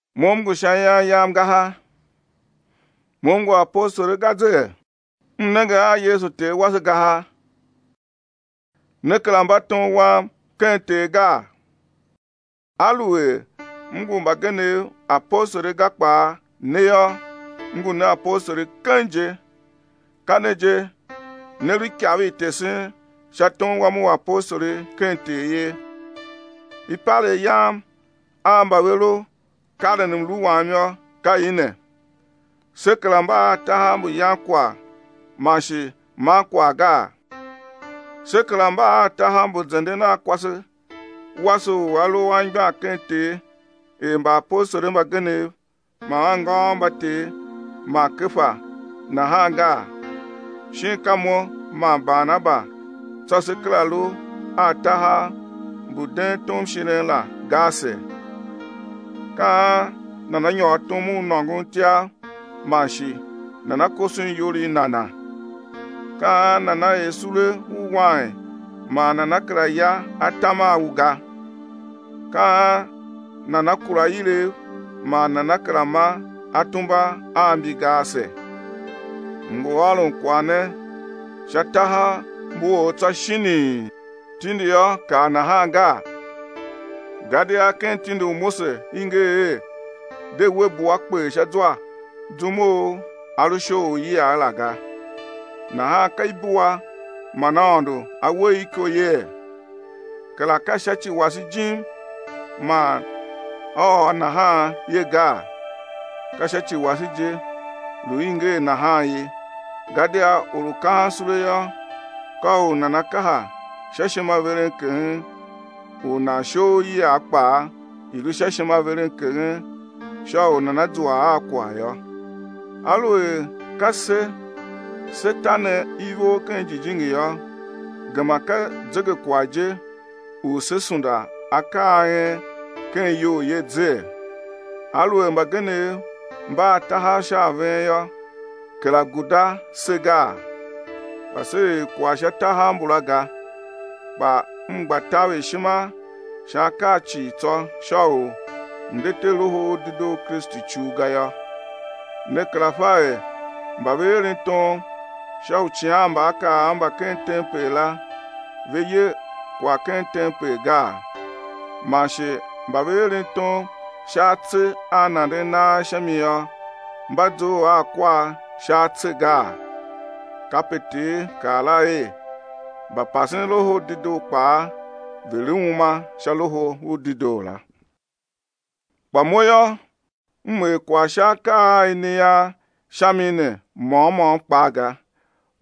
Mo m ngu sha ian yam ga ha? Mo m ngu apostoli ga zee? M nenge a Yesu Ter wase ga ha? Ne kera mba tom wam ken Ter gaa? Aluer m ngu mbagenev apostoli ga kpaa, ne yô, m ngu ne apostoli keng je. Ka ne je, ne lu ikav i tesen sha tom wam u apostoli ken Ter ye. Ipalegh yam a mba ve lu karen mlu wam yô, ka i ne: Se kera mba a tahav mbu yan kwagh, man shi man kwagh gaa? Se kera mba a tahav mbu zenden a kwase wase u a lu anmgbian ken Ter er mbaapostoli mbagenev man anngôôv mba Ter man Kefa nahan gaa? Shin ka mo man Barnaba tsô se kera lu a tahav mbu den tomshiren la ga ase? Ka an nana nyôr tom u nôngon ityav man shi nana koson iyol i nana? Ka an nana er sule u wain man nana kera ya atam a u ga? Ka an nana kura ilev man nana kera ma atumba a mbi ga ase? M ngu ôron kwagh ne sha tahav mbu or tsô shinii? Tindi yô, kaa nahan gaa? Gadia ken tindi u Mose i nger er: De we bua kper sha zwa zum u a lu shoghol iyiagh la ga. Nahan ka ibua man Aôndo A we i iko yee? Kera ka sha ci wase jim man A ôr nahan ye gaa? Ka sha ci wase je lu i nger nahan ye, gadia or u kahan sule yô, ka u nana kaha sha ishimaverenkeghen, u nan shoghol iyiagh kpaa, i̱ lu sha ishimaverenkeghen, sha u nana zua a kwagh yô. Aluer ka se se te ne ivor ken jijingi yô, gema ka zegekwagh je u sé sunda akaa a en ken iyol ye zee? Aluer mbagenev mba a tahav sha a ven yô, kera guda se gaa? Kpa se er kwagh sha tahav mbula ga; kpa m gba taver ishima sha akaa cii tsô sha u m̱ de te Loho u Dedoo u Kristu icul ga yô. Ne kera fa er mba ve eren tom sha uicighanmbaakaav mba ken tempel la ve ye kwagh ken tempel gaa? Man shi mba ve eren tom sha atse a nanden nagh sha mi yô, mba zough a kwar sha atse gaa? Kape Ter kaa la er: mbapasen Loho u Dedoo kpaa, ve̱ lu uma sha Loho u Dedoo la. Kpa mo yô, m er kwagh sha akaa a i ne ian sha mi ne môm môm kpaa ga.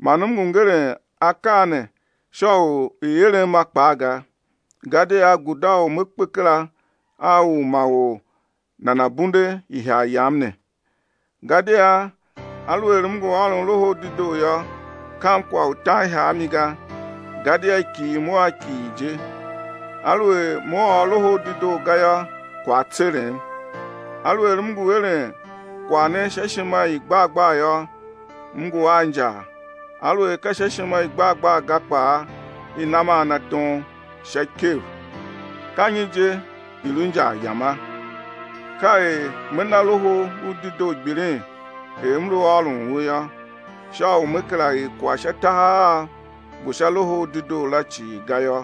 Man m ngu ngeren akaa ne sha u i̱ erem a kpaa ga, gadia guda u me kpe kera a u ma or nana̱ bunde ihagh yam ne. Gadia aluer m ngu ôron Loho u Dedoo yô, kam kwagh u tan ihagh a mi ga, gadia i kighir mo a kighir je. Aluer me ôr Loho u Dedoo ga yô, kwagh á tserem. Aluer m ngu eren kwagh ne sha ishima i gbar gbar yô, m ngu a injar, aluer ka sha ishima i gbar gbar ga kpaa, i nam a na tom sha ikev. Ka nyi je i lu injar yama? Ka er me na Loho u Dedoo gbilin er m lu ôron u yô, sha u me kera er kwagh sha tahav av mbu sha Loho u Dedoo la cii ga yô.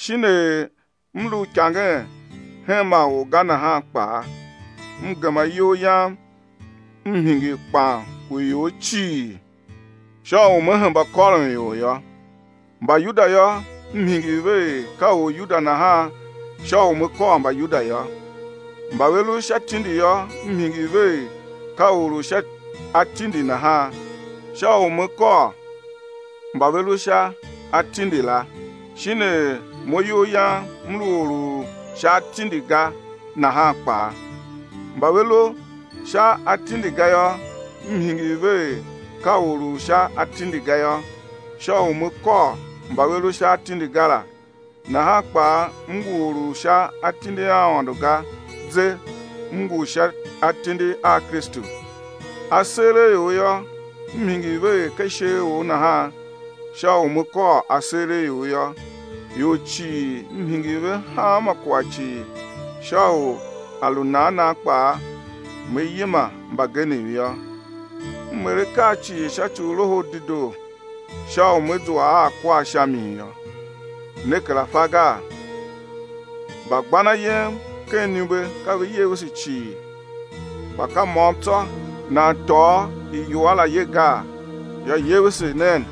Shin er m lu uikangen hen ma or ga nahan kpaa, m gema iyol yam m hingir kpan u ior cii sha u me hemba kôron ior yô. Mbayuda yô, m hingir ve er ka Oryuda nahan sha u me kôr Mbayuda yô. Mba ve lu sha tindi yô, m hingir ve er ka or u sha atindi nahan, sha u me kôr mba ve lu sha atindi la, shin er mo iyol yam m lu or u sha atindi ga nahan kpaa. Mba ve lu sha atindi ga yô, m hingir ve er ka or u sha atindi ga yô, sha u me kôr mba ve lu sha atindi ga la, nahan kpaa m ngu or u sha atindi a Aôndo ga ze, m ngu sha atindi a Kristu. Aseeraior yô, m hingir ve er ka isheeror nahan sha u me kôr aseeraior yô. Ior cii m hingir ve hanma kwagh cii, sha u a lu nan nan kpaa, me yima mbagenev yô. M er akaa cii sha ci u Loho u Dedoo sha u me zua a kwar sha mi yô. Ne kera fa gaa? Mbagban ayem ken iniumbe ka ve yevese cii, kpa ka môm tsô nan tôô iwua la ye gaa? Yô, yevese nen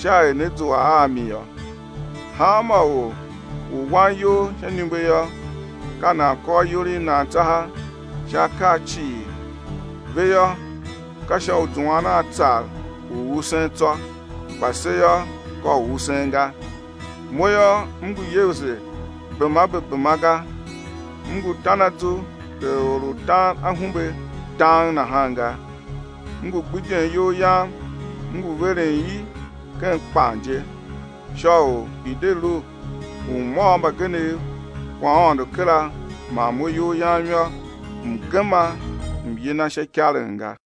sha er né zua a mi yô. Hanma or u wan iyol sha iniumbe yô, ka nan kôr iyol i nan tsaha sha akaa cii. Ve yô, ka sha u zuan a tsar u usen tsô, kpa se yô, ka u usen ga. Mo yô, m ngu yevese bema be bema ga, m ngu tan azu er or u tan ahumbe dang nahan ga. M ngu gbidyen iyol yam m ngu veren i ken kpan je, sha u i̱ de lu u m ôr mbagenev kwaghaôndo kera man mo iyol yam yô, m̱ gema m̱ yina sha ikaren ga.